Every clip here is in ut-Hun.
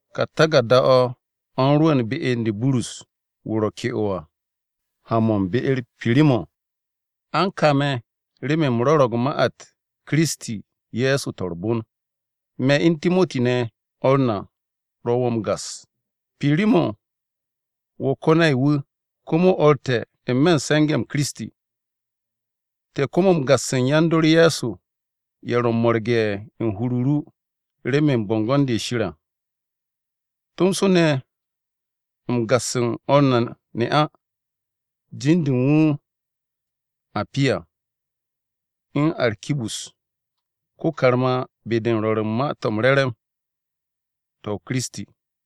Ka taku̱rda-o̱ u̱n rwu̱u̱n be u̱n de Burus, wu̱ ro̱ ke'o à, ha-mo̱ u̱n be-u̱r Pirimo̱n. A u̱n ka me̱ remen u̱m rwo̱ro̱g ma-u̱t Kiristi Ye̱so to̱ u̱r-bon. Me̱ u̱n Timoti ne̱ o̱r na ro̱ wo̱ m-gas. Pirimo̱n wo̱ ko-nay-wu̱, komo o̱r te̱ n-me̱ u̱n se̱nge̱-m Kiristi. Te̱ komo m-gas u̱n yan-dor Ye̱so, ye̱ ro̱ m-mo̱rge̱ u̱n hur-o ru remen bo̱ngo̱n-de Shir à. Tomso te̱ m-gas u̱n o̱r na ne'a, jin-de u̱n wu̱ Apiya, u̱n Arkibus ko-karma be-de u̱n rwo̱r u̱n Ma-to̱ m-Re̱re̱m to̱ ma Kiristi.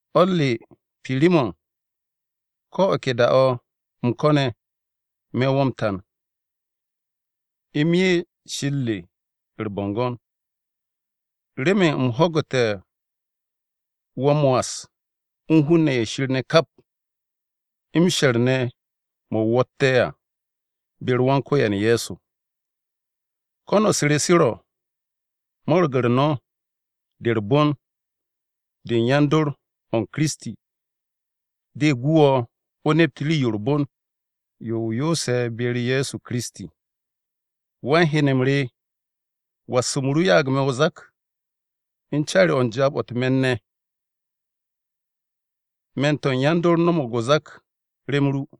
O̱r re Pirimo̱n, ko̱ o̱ ke da-o̱ u̱m ko̱ne̱, me̱ wo̱ m-tan u̱m 'ye Shir re u̱r-bo̱ngo̱n, remen u̱m ho̱gu̱te̱ wo̱ m-was u̱n hun-ne̱ ye̱ Shir ne̱ kap, m-she̱r ne̱ mo̱ wo̱tte̱ à, be-u̱r Wan-Ko̱yan Ye̱so. Ko̱n-u̱s re se ro̱, mo̱ro̱g-u̱r no̱ de u̱r-bon de u̱n yan-dor o̱ u̱n Kiristi, de gu wo̱ o nept rii-yo u̱r-bon, yo o yoose̱ be-u̱r Ye̱so Kiristi. Wan-henem re, was-m ru ya'ag me̱ o-zak u̱n caari-o̱ u̱n jaab-o̱ u̱t-me̱n ne̱! Me̱n-to̱ u̱n yan-dor no̱mo̱g o-zak rem ru.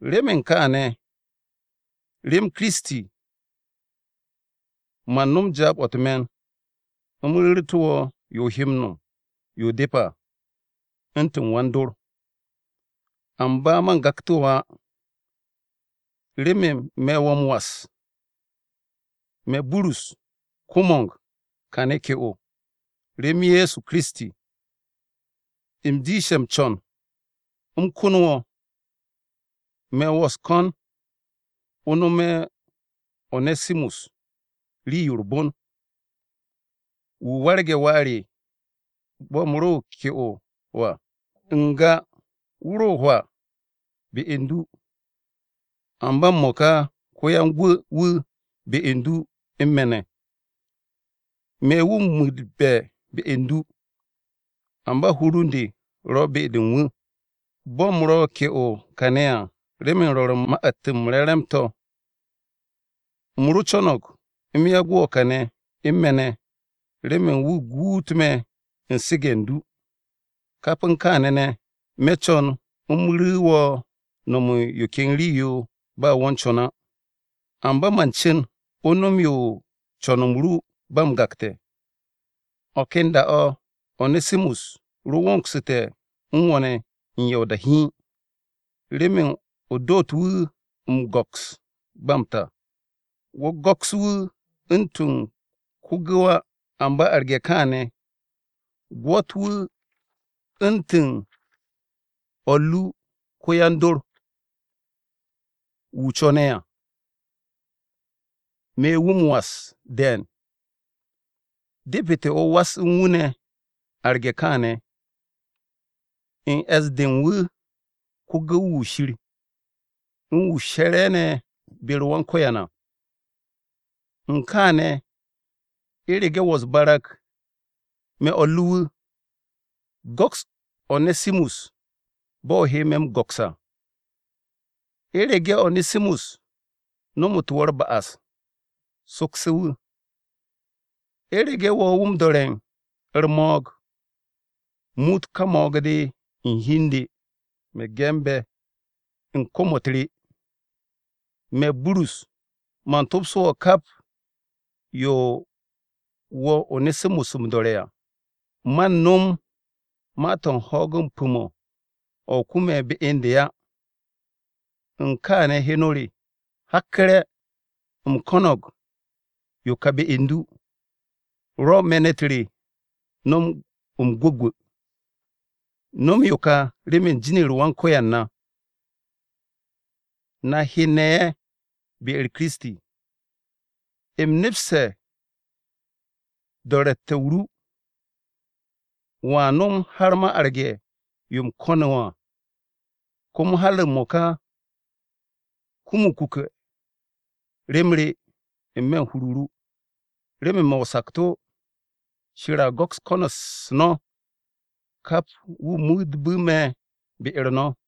Remen kaane̱, rem Kiristi, man nom jaab-o̱ u̱t-me̱n, u̱m ru̱ru̱tu̱ wo̱ yo o he nom yo depe̱ à u̱ntu̱n wan-dor. Amba man gaktu̱ wo̱ á, remen me̱ wo̱ m-was. Me̱, Burus, ko-mo̱ng kane̱ ke'o, rem Kiristi Ye̱so, u̱m jiishte̱ m-co̱n u̱m kon wo̱. Me̱ wo̱ u̱s-ko̱n o nome̱ One̱simus rii-yo u̱r-bon, wu̱ warge̱ wà re bo̱ u̱m ro ke'o à. N-ga wu̱ ro hwaa be u̱n du, amba m-mo̱ka ko-yan-gwu̱-wu̱ be u̱n du u̱n me̱ ne̱. Me̱ wu̱ m-muutbe̱ be u̱n du, amba hur u̱n de ro̱ be-de u̱n wu̱. Bo̱ u̱m ro̱ ke'o kàne̱ à, remen rwo̱ru̱ u̱n Ma-u̱t m-Re̱re̱m à, u̱m ro co̱no̱g u̱m yagu̱ wu̱ kàne̱ u̱n me̱ ne̱ remen wu̱ guut me̱ u̱n su̱ge̱ u̱n du. Kap u̱n kaane̱ ne̱, me̱ co̱n u̱m ru̱ wo̱ no̱m u̱n yo ken rii-yo ba wo̱ u̱n co̱n á. Amba man cu̱n o nom yo u̱n co̱n-m ru ba m-gakte̱. O̱ ken da-o̱, One̱simus ro wongu̱te̱ u̱n wo̱ ne̱ u̱n ya o-da hiin, remen o doot wu̱ m-go̱ks ba m-ta. Wo̱ go̱ks wu̱ u̱ntu̱n ko-gu̱w á, amba arge̱ kaane̱, gwo̱t wu̱ u̱ntu̱n o̱r ru ko-yan-dor, wu̱ o co̱ne̱ à. Me̱ wu̱ m-was de̱e̱n. Depete̱ o was u̱n wu̱ ne̱ arge̱ kaane̱, u̱n e̱s-de u̱n wu̱ ko-gu̱w-wu̱ Shir, u̱n wu̱ she̱re̱ ne̱ be-u̱r Wan-Ko̱yan à. U̱n kaane̱, u̱rege̱ wo̱ u̱s-barag, me̱ o̱r ru wu̱, go̱ks One̱simus bo̱ o he me̱ m-go̱ks à. U̱rege̱ One̱simus nomotu̱ wo̱ u̱r-ba'as, sokse̱ wu̱. U̱rege̱ wo̱ wu̱ m-do̱re̱ u̱r-mo̱o̱g, muut ka mo̱o̱g-de u̱n hi u̱n de. Me̱ ge̱nbe̱ u̱n kom-u̱t re: Me̱, Burus, man topso wo̱ kap yo wo̱ One̱simus m-do̱re̱ à. (Man nom ma-to̱ u̱n ho̱o̱g pu̱-o̱, o̱ o kume̱ be u̱n de á.) U̱n kaane̱ heno re, hakku̱re̱, u̱m ko̱no̱g yo ka be u̱n du, rwo̱ me̱n-u̱t re nom m-gwu̱gwu̱! No̱m yo ka remen jin-u̱r Wan-Ko̱yan na, na hen-ne̱ ye̱ be-u̱r Kiristi. U̱m nepse̱ do̱ro̱tte̱-o ru, wo̱a nom har ma arge̱ yo u̱m ko̱ne̱ wo̱ à. Komo har m-mo̱ka, kum o-kuke̱ rem re n-me̱ u̱n hur-o ru, remen me̱ o-sakto̱, Shir a go̱ks ko̱n-u̱s no̱ kap wu̱ muutbu̱ me̱ be-u̱r no̱.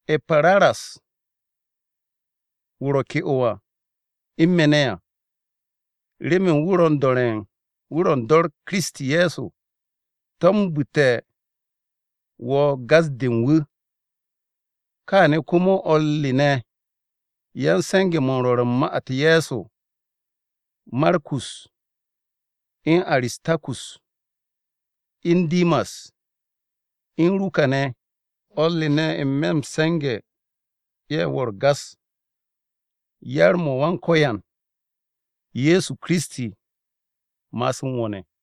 E̱paparas, wu̱ ro̱ ke'o u̱n me̱ ne̱ à, remen wu̱ ro̱ u̱n dor Kiristi Ye̱so, tombu̱tu̱ wo̱ gas-de u̱n wu̱. Kaane̱ komo o̱r re ne̱ yan-se̱nge̱-mo̱ u̱n rwo̱ru̱ u̱n ma-u̱t Ye̱so, Markus, u̱n Aristarkus, u̱n Dimas, u̱n Ruka ne̱, o̱r re ne̱ n-me̱ m-se̱nge̱ ye̱ wo̱ u̱r-gas. Yar-mo̱ Wan-Ko̱yan Ye̱so Kiristi ma'as u̱n wo̱ ne̱!